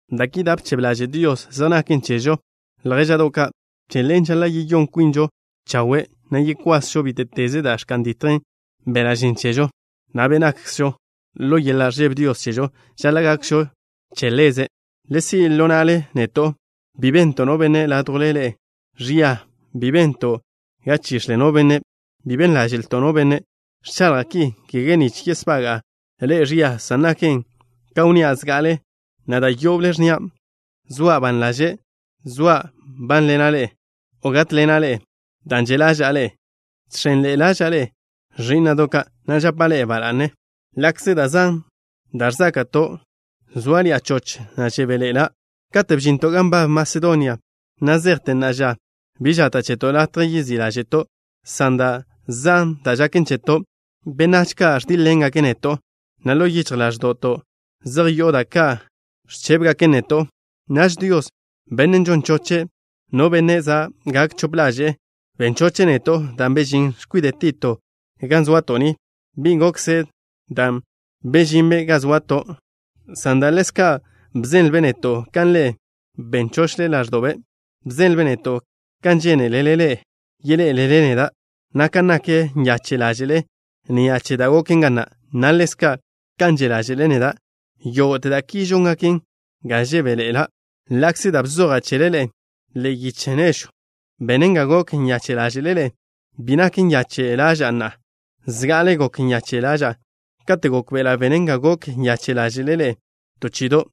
Da' ki da' bchebe ḻaže' Dios zej naken chežo, ljéža'do' ka'. Che ḻen žaḻa' yeyón kwinžo chawe', na' yekwasžo bíte'teze da' ẕka'n ditjen beḻa' žen chežo, na' be' nakkzžo. Ḻo yeḻa' ẕžebe Dios chežo žaḻa' gakžo che Ḻeze'. Le si' ḻo na'le neto'. Bi bento' no benne' ládjwle ḻe'e ẕia. Bi bento' ga chix̱le no benne'. Bi ben ḻáže'lto' no benne'. Ẕchaḻja' ki, kege nich yesbaga'a ḻe'e ẕia, san naken ka wnnía' zga'ale, na' da' yoble ẕnnia': zoa' ban ḻaže' soa' nbánḻena' ḻe'e o gátḻena' ḻe'e dan' že' ḻaža'a ḻe'e. Žx̱enḻe'e ḻaža'a ḻe'e, ẕí'na'do' ka', na' žapa' ḻe'e ba la'ne. Ḻa'kze da' zan da' ẕzáka'to', zóaḻi'a choch, na' žebéḻe'ela'. Katen' bžinto' gan nbab Masedonia, na' zejte na'a ža, bi žata' cheto' latje yezí' ḻáže'to', san da' zan da' žaken cheto'. Benách ka' ẕdíḻ-ḻengake' neto', na' ḻo yichj ḻáẕdo'to' zej yo'o da' ka' ẕchébegaken neto'. Naž Dios, Bennen' žon choche' no benne' za' gak chope ḻaže'e, ben choche' neto' dan' bežín x̱kwide' Tito ga zoato' ni. Bi gokzen dan' bežinbe' ga zoato' ni, san dan' ḻezka' bzenlbe' neto' kan ḻe'e ben chochle ḻáẕdo'be'. Bzenlbe' neto' kan žéneḻe'elele yeḻé'elele neda', na' kan nak nyache' ḻáže'le ni'a che da' goken ga na', na' ḻezka' kan že' ḻáže'le neda'. Yógo'te da' ki žóngaken ga žebéḻe'ela'. Ḻa'kze da' bzoja' chele ḻe'e ḻe'e yiche nežwn' benen ga gok nyache' ḻáže'le ḻe'e, bi nak nyache' ḻaža'a na'a. Zga'ale gok nyache' ḻaža'a kate' gókbe'ela' benen ga gok nyache' ḻáže'le ḻe'e to chi'ido',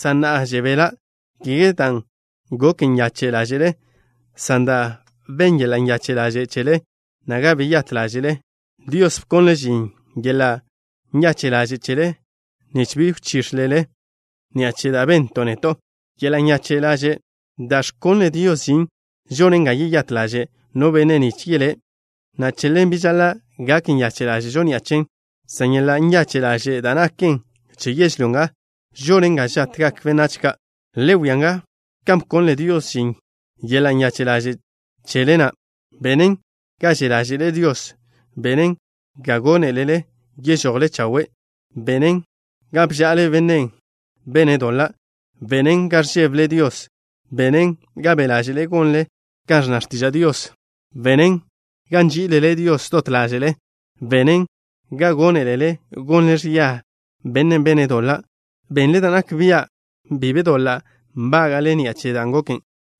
san na'a žebela', kege dan' gok nyache' ḻáže'le, san dan' ben yeḻa' nyache' ḻaže' chele na' ga beyát ḻáže'le. Dios bkonle' žin yeḻa' nyache' ḻaže' chele na', nich bi wchíx̱elele ḻe'e ni'a che da' bento' neto'. Yeḻa' nyache' ḻaže' da' ẕkonle Dios žin žonen ga yeyát ḻaže' no benne' nich yelé', na' che ḻen bi žaḻa' gak nyache' ḻáže'žo ni'a chen, san yeḻa' nyache' ḻaže' da' naken che yežlyó nga žonen ga žatgak benách ka'. Le wia nga kan bkonle Dios žin yeḻa' nyache' ḻaže' chele na': Benen ga že' ḻáže'le Dios. Benen ga gónelele yežojle chawe'. Benen ga bža'ale bennen' bene' doḻan'. Benen ga ẕžébele Dios. Benen ga be' ḻáže'le gonle kan ẕnna x̱tiža' Dios. Benen ga nží'ilele Dios dot ḻáže'le. Benen ga gónelele gonle ẕia bennen' bene' doḻan'. Benle da' nak bia' bi be doḻa' nbága'le ni'a che dan' goken.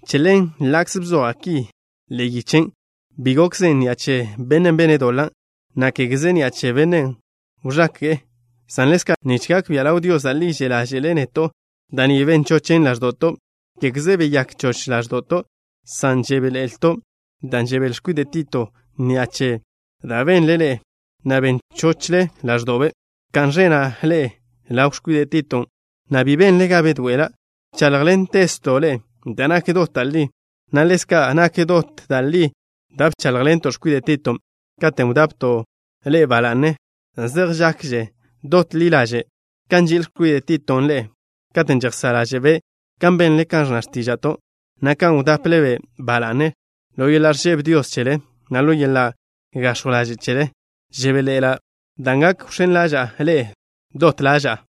Che ḻen, ḻa'kze bzoja' ki ḻe'e yichen', bi gokzen ni'a che bennen' bene' doḻan', na' kégeze ni'a che bennen' wẕake'e, san ḻezka' nich gak bia' ḻaw Dios da' li že' ḻáže'le neto'. Da' ni ben chochen ḻáẕdo'to'. Kégeze beyák choch ḻáẕdo'to' san žebéḻe'elto' dan' žebél x̱kwide' Tito ni'a che da' benle ḻe'e, na' ben chochle ḻáẕdo'be'. Bka'n ẕena' ḻe'e ḻaw x̱kwide' Titon', na' bi benle ga bedoe'ela'. Bcháḻjḻentezto' ḻe'e da' nak dot da' li, na' ḻezka' nak dot da' li da' bcháḻjḻento' x̱kwide' Titon' katen' wdapto' ḻe'e ba la'ne. Zej žakže dot ḻi ḻaže' kan nži'il x̱kwide' Titon' ḻe'e kate' žejsá' ḻáže'be' kan benle kan ẕnna x̱tíža'to', na' kan wdaple-be' ba la'ne ḻo yeḻa' ẕžebe Dios chele, na' ḻo yeḻa' gax̱jw ḻaže' chele. Žebéḻe'ela' dan' gak wx̱én ḻaža'a ḻe'e dot ḻaža'a.